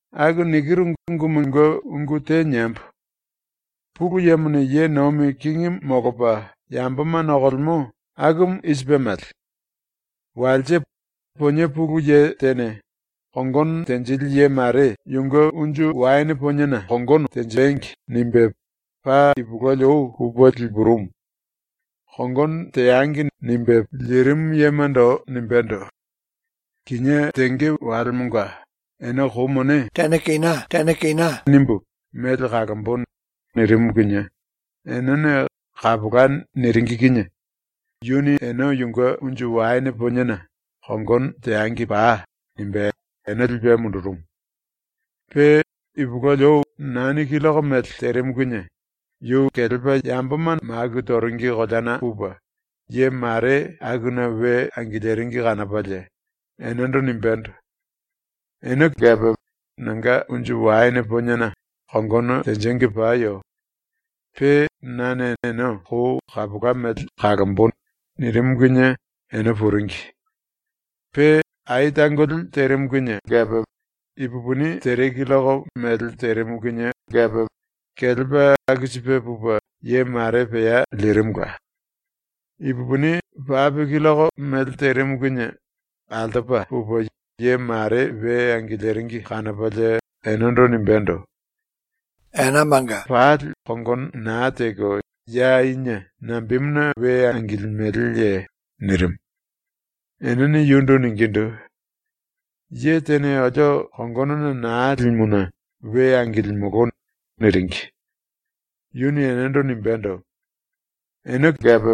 “Aku nikiru ungumunge ⸤ungu te niembo⸥: Pulu Yemone ye nomi kingimu molopa yamboma nokolemo akumu i sipe mele: “Walse ponie pulu ye tene ‘Kongono tenjili ye mare yunge unju waene poniena kongono tenjengi.’ nimbe paa ipulueli ou pupe lipurumu. “Kongono teangi.” nimbe lirimu yemando nimbendo: “Kinié tenge walemonga ene kou mone pape kina pape kina nimbu mele kalombo.” nirimu kinie enene “Kapola.” niringi kinie yuni ene yunge unju waene poniena “Kongono teangi pai.” nimbe ene lipe mundurumu. Pe, ipulueli ou nani killoko mele terimu kinie, yu kelepa yamboma maku toringi koleana pupe ye mare akuna we angiliringi kanopalie enendo nimbendo: “Ene kepe ⸤nanga⸥ unju waene poniena kongono tenjengi payo. Pe nane ene kou kapola mele kalombo.” nirimu kinie ene puringi. Pe ai tangoli terimu kinie kepe, ipupini tere killoko mele terimu kinie kepe, kelepa aku sipe pupe ye mare pea lirimula. Ipupini pape killoko mele terimu kinie ⸤altopa⸥ pupe ye mare we angiliringi kanopalie enendo nimbendo: “Walemonga pali kongono na teko ya inie nambemuna we angilimeleye?” nirimu. Enene yundu ningindu: “Ye tene olio kongonona na limuna we angilimolo.” niringi. Yuni enendo nimbendo: “Ene kepe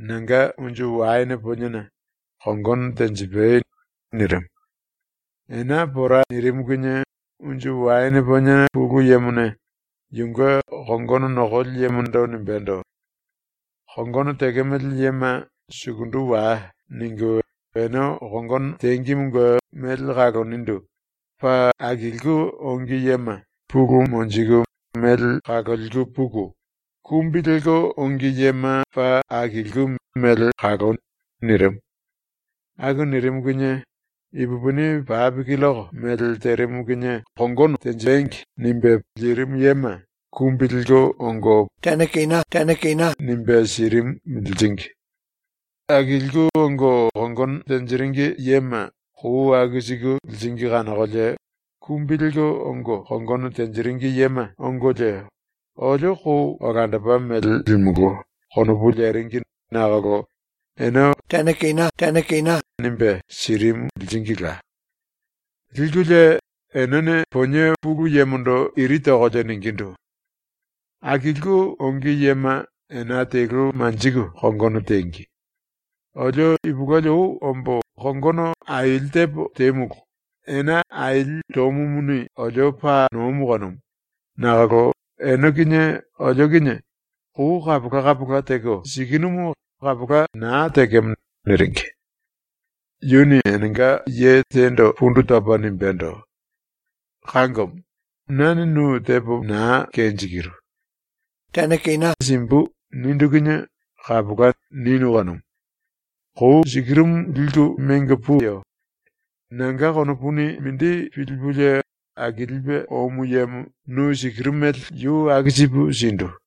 ⸤nanga⸥ unju waene poniena kongono tenjipai.” nirimu. Ena pora nirimu kinie unju waene ponie pulu yemone yunge kongono nokoli yemondo nimbendo: “Kongono tekemele yema ‘sukundu wai.’ ningu ene kongono tengimunge mele kalonindu paa akilku ongi yema pulu monjiku mele kaloliku puku kumbi lelko ongi yema paa akilku mele kaloi.” nirimu. ⸤Aku nirimu kinie⸥ ipupini pape killoko mele terimu kinie “Kongono tenjengi.” nimbe lirimu yema ⸤kumbi lelko⸥ ongo pape kina pape kina nimbe sirimu liringi. Akilku ongo kongono tenjiringi yema kou aku siku liringi kanokolie kumbi lelko ongo kongono tenjiringi yema ongolie ‘Olio kou olandopa mele limulú.’ konopu leringi nakolo ene pape kina pape kina nimbe sirimu liringila. Likulie enene ponie pulu yemondo iri tokolie ningindu: “Akilku ongi yema ena telu manjiku kongono tengi, olio ipulueli ou ombo kongono aili tepo temulu, ena aili tomumuni olio paa nomu kanumu, nakolo ene kinie olio kinie kou kapola kapola teko sikinumu, kapola na tekemo.” niringi. Yuni enenga ye tendo pundu topa nimbendo: “Kangomo, nane nu tepo na kenjikiru. “Pape kina simbu.” nindu kinie “Kapola.” ninu kanumu. Kou sikirumu liku mengo puyo. Nanga konopuni mindi pilipulie akilipe omu yemo nu sikiru mele yu aku sipu sindu.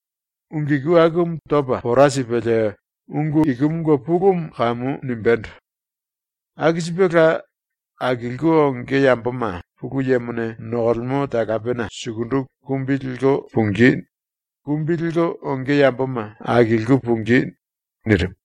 ⸤Ungu iku akumu topa pora sipelie ungu ikumunge pulumu kamu nimbendo:⸥ “Aku sipela, akilku onge yamboma ⸤Pulu Yemone nokolemo talapena sukundu⸥ kumbi lelko pungí; kumbi lelko onge yamboma akilku pungí.” nirimu.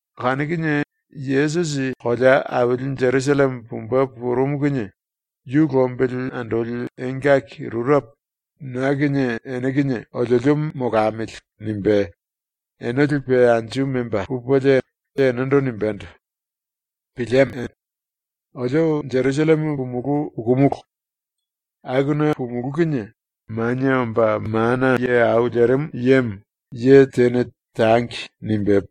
Kanu kinie Yesusi kolea aili Jerusalleme pumbe purumu kinie yu lombili andoli engaki rurepo ‘na kinie ene kinie oliolio molamili.’ nimbe ene lipe anju memba pupelie enendo nimbendo: “Pilieme! Olio Jerusalleme pumulú pukumulu. Akuna pumulú kinie Manie Omba Mana Ye Au Lerimu Yemo ye tene ‘Tangi.’ nimbe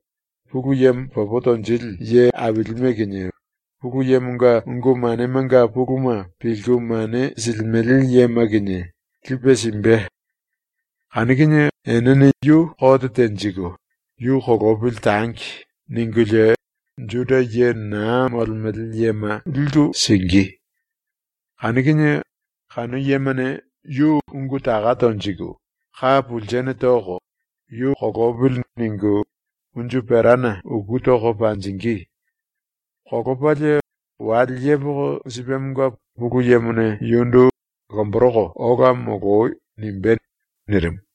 Pulu Yemo popo tonjili ye ailime kinie, Pulu Yemonga ungu manemanga puluma pilku mane silimele yema kinie, lipe simbe, enene yu kote tenjiku ‘Yu kolopili tangi.’ ningulie Juda ye na molemele yema liku singí. Kanu kinie kanu yemane yu ungu taka tonjiku, ka pulsene toko, ‘Yu kolopili.’ ningu unju perana uku toko panjingí. Kolopalie wale yepoko sipemonga Pulu Yemone yundu ‘Lomboroko ola moloi.’ nimbé.” nirimu.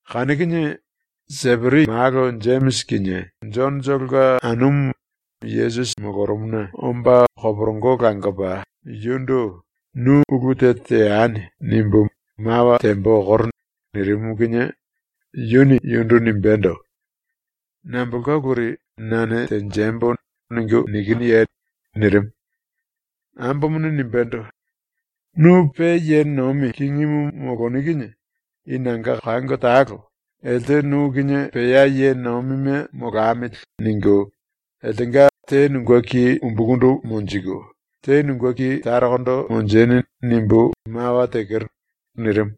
Kanu kinie Seperi malo Jemisi kinie Jonotolonga anumu Yesusi molorumuna omba koporongo langopa yundu “‘Nu ulu te teani.’ nimbu mawa tembo okoro.” nirimu kinie yuni yundu nimbendo: “Nambolka uluri ‘nane tenjembo.’ ningu nikinuye?” nirimu. Ambomone nimbendo: “Nu pe ye nomi kingimu moloni kinie i nanga kango talo ⸤‘elte nu kinie pea ye nomime molamili.’ ningu⸥ ‘eltenga te nunge ki umbukundu monjiku te nunge ki tarokondo monjeni.’ nimbu mawa tekero.” nirimu.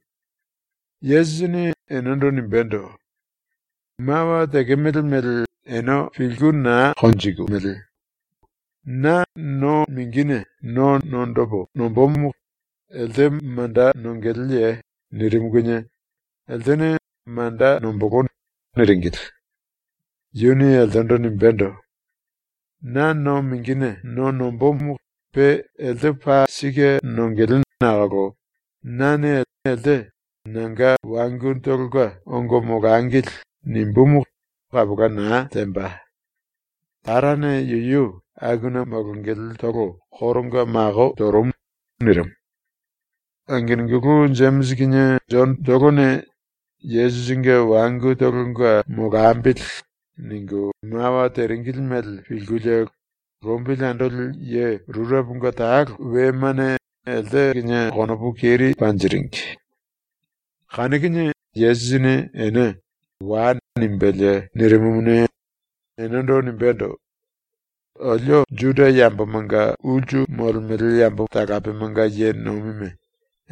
Yesusini enendo nimbendo: “Mawa tekemele mele ene pilku na konjikimili. Na no mingine no nondopo nombomo elte manda nongeleye?” nirimu kinie eltene “Manda nombolo.” niringili. Yuni eltendo nimbendo: “Na no mingine no nombomo pe elte paa sike nongele nakolo nane elte “Nanga wangutolonga ongo molangili.” nimbumu kapola na temba. Tarane yuyu akuna molongeletolo koronga mako torumu.” nirimu. Angenungulu ⸤Jemisi kinie Jonotolone ‘Yesusinge wangutolonga molambili.’⸥ ningu mawa teringili mele pilkulie lombili andoli ye rureponga talo ⸤wemane⸥ elte kinie konopu keri panjiringi. Kanu kinie Yesusini ene “Wai.” nimbelie nirimumuni, enendo nimbendo: “Olio Juda yambomanga ulsu molemele yambo talapemanga ye nomime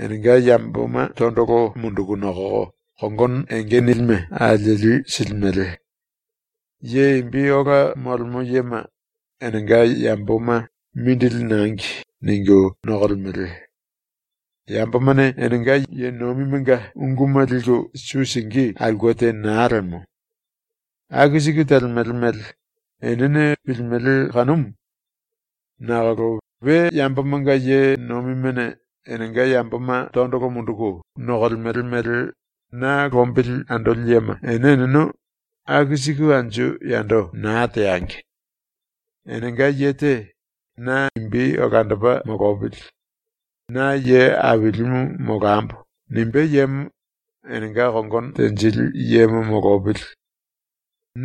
enenga yamboma tondolo munduku nokoko kongono enge nilime alieli silimele. Ye imbi ola molemo yema enenga yamboma ‘Mindili nangi.’ ningu nokolemele. Yambomane enenga ye nomimenga unguma liku su singí aulke te na lemo. Aku siku telemele mele enene pilimele kanumu. Nakolo ⸤we yambomanga ye nomimene enenga yamboma tondolo munduku nokolemele mele na lombili andoli yema⸥ ene eneno aku siku anju yando na teangi. Enenga ye te ‘Na imbi olandopa molopili. Na ye ailimu molambo.’ nimbé yemo enenga kongono tenjili yemo molopili.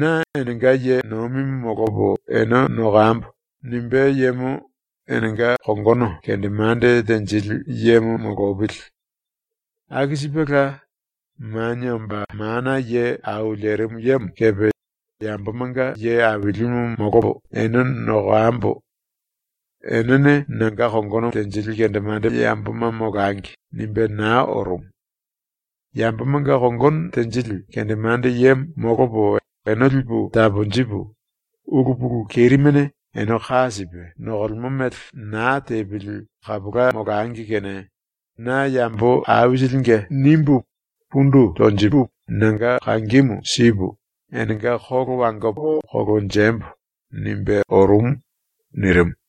‘Na enenga ye nomimu molopo ene nokambo.’ nimbé yemo enenga kongono kendemande tenjili yemo molopili. Aku sipela, Manie Omba Mana Ye Au Lerimu Yemo kepe ‘Yambomanga ye ailimu molopo ene nokambo. Enene nanga kongono tenjili kendemande yamboma molangi.’ nimbe na orumu. ‘Yambomanga kongono tenjili kendemande yemo molopo ene lipu taponjipu, ulu pulu kerimene ene ka sipe nokolemo mele na tepili kapola molangi kene na yambo aisilinge nimbu pundu tonjipu nanga kangimu sipu, enenga kolo wangopo kolonjembo.’ nimbe orumu.” nirimu.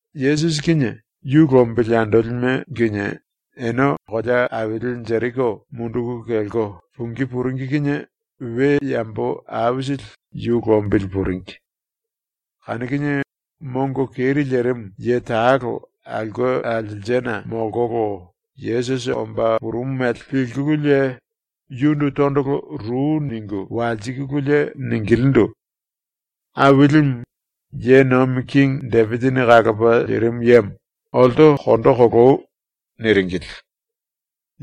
Yesusi kinie yu lombili andolime kinie ene kolea aili Jeriko munduku kelko pungí puringi kinie we yambo aisili yu lombili puringi. Kanu kinie mongo keri lerimu ye talo aulke alselsena molkolo Yesusi omba purumu mele pilkululie yundu tondolo ru ningu walsikulie ningilindu: “Ailimu, ⸤ye nomi kingi⸥ Depisini kalopa lirimu yemo, olto kondo koloi.” niringili.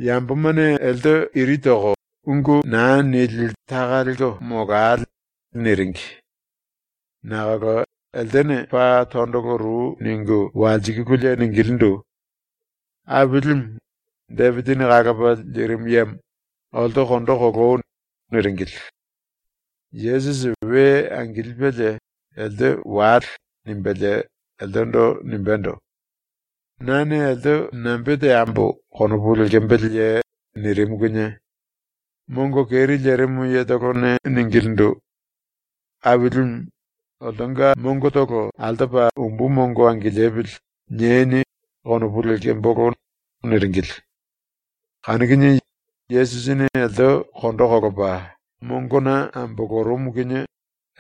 Yambomane elte iri toko “Ungu na nili taka lelko molale.” niringi. Nakolo eltene paa tondolo ru ningu walsikululie ningilindu: “Ailimu, Depisini kalopa lirimu yemo, olto kondo koloi.” niringili. Yesusi we angilipelie “Elte wale.” nimbelie eltendo nimbendo: “Nane elte nambe teambo konopu lekembeleye?” nirimu kinie mongo keri lerimu yetolone ningilindu: “Ailimu, ‘oltonga mongotolo ‘Altopa umbu mongo angilipili.’ nieni.’ konopu lekembolo.” niringili. Kanu kinie Yesusini elte kondo kolopa mongona ambolorumu kinie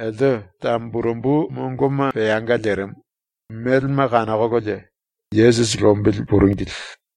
elte tamburembu mongoma peanga lerimu, melema kanokololie, Yesusi lombili puringili.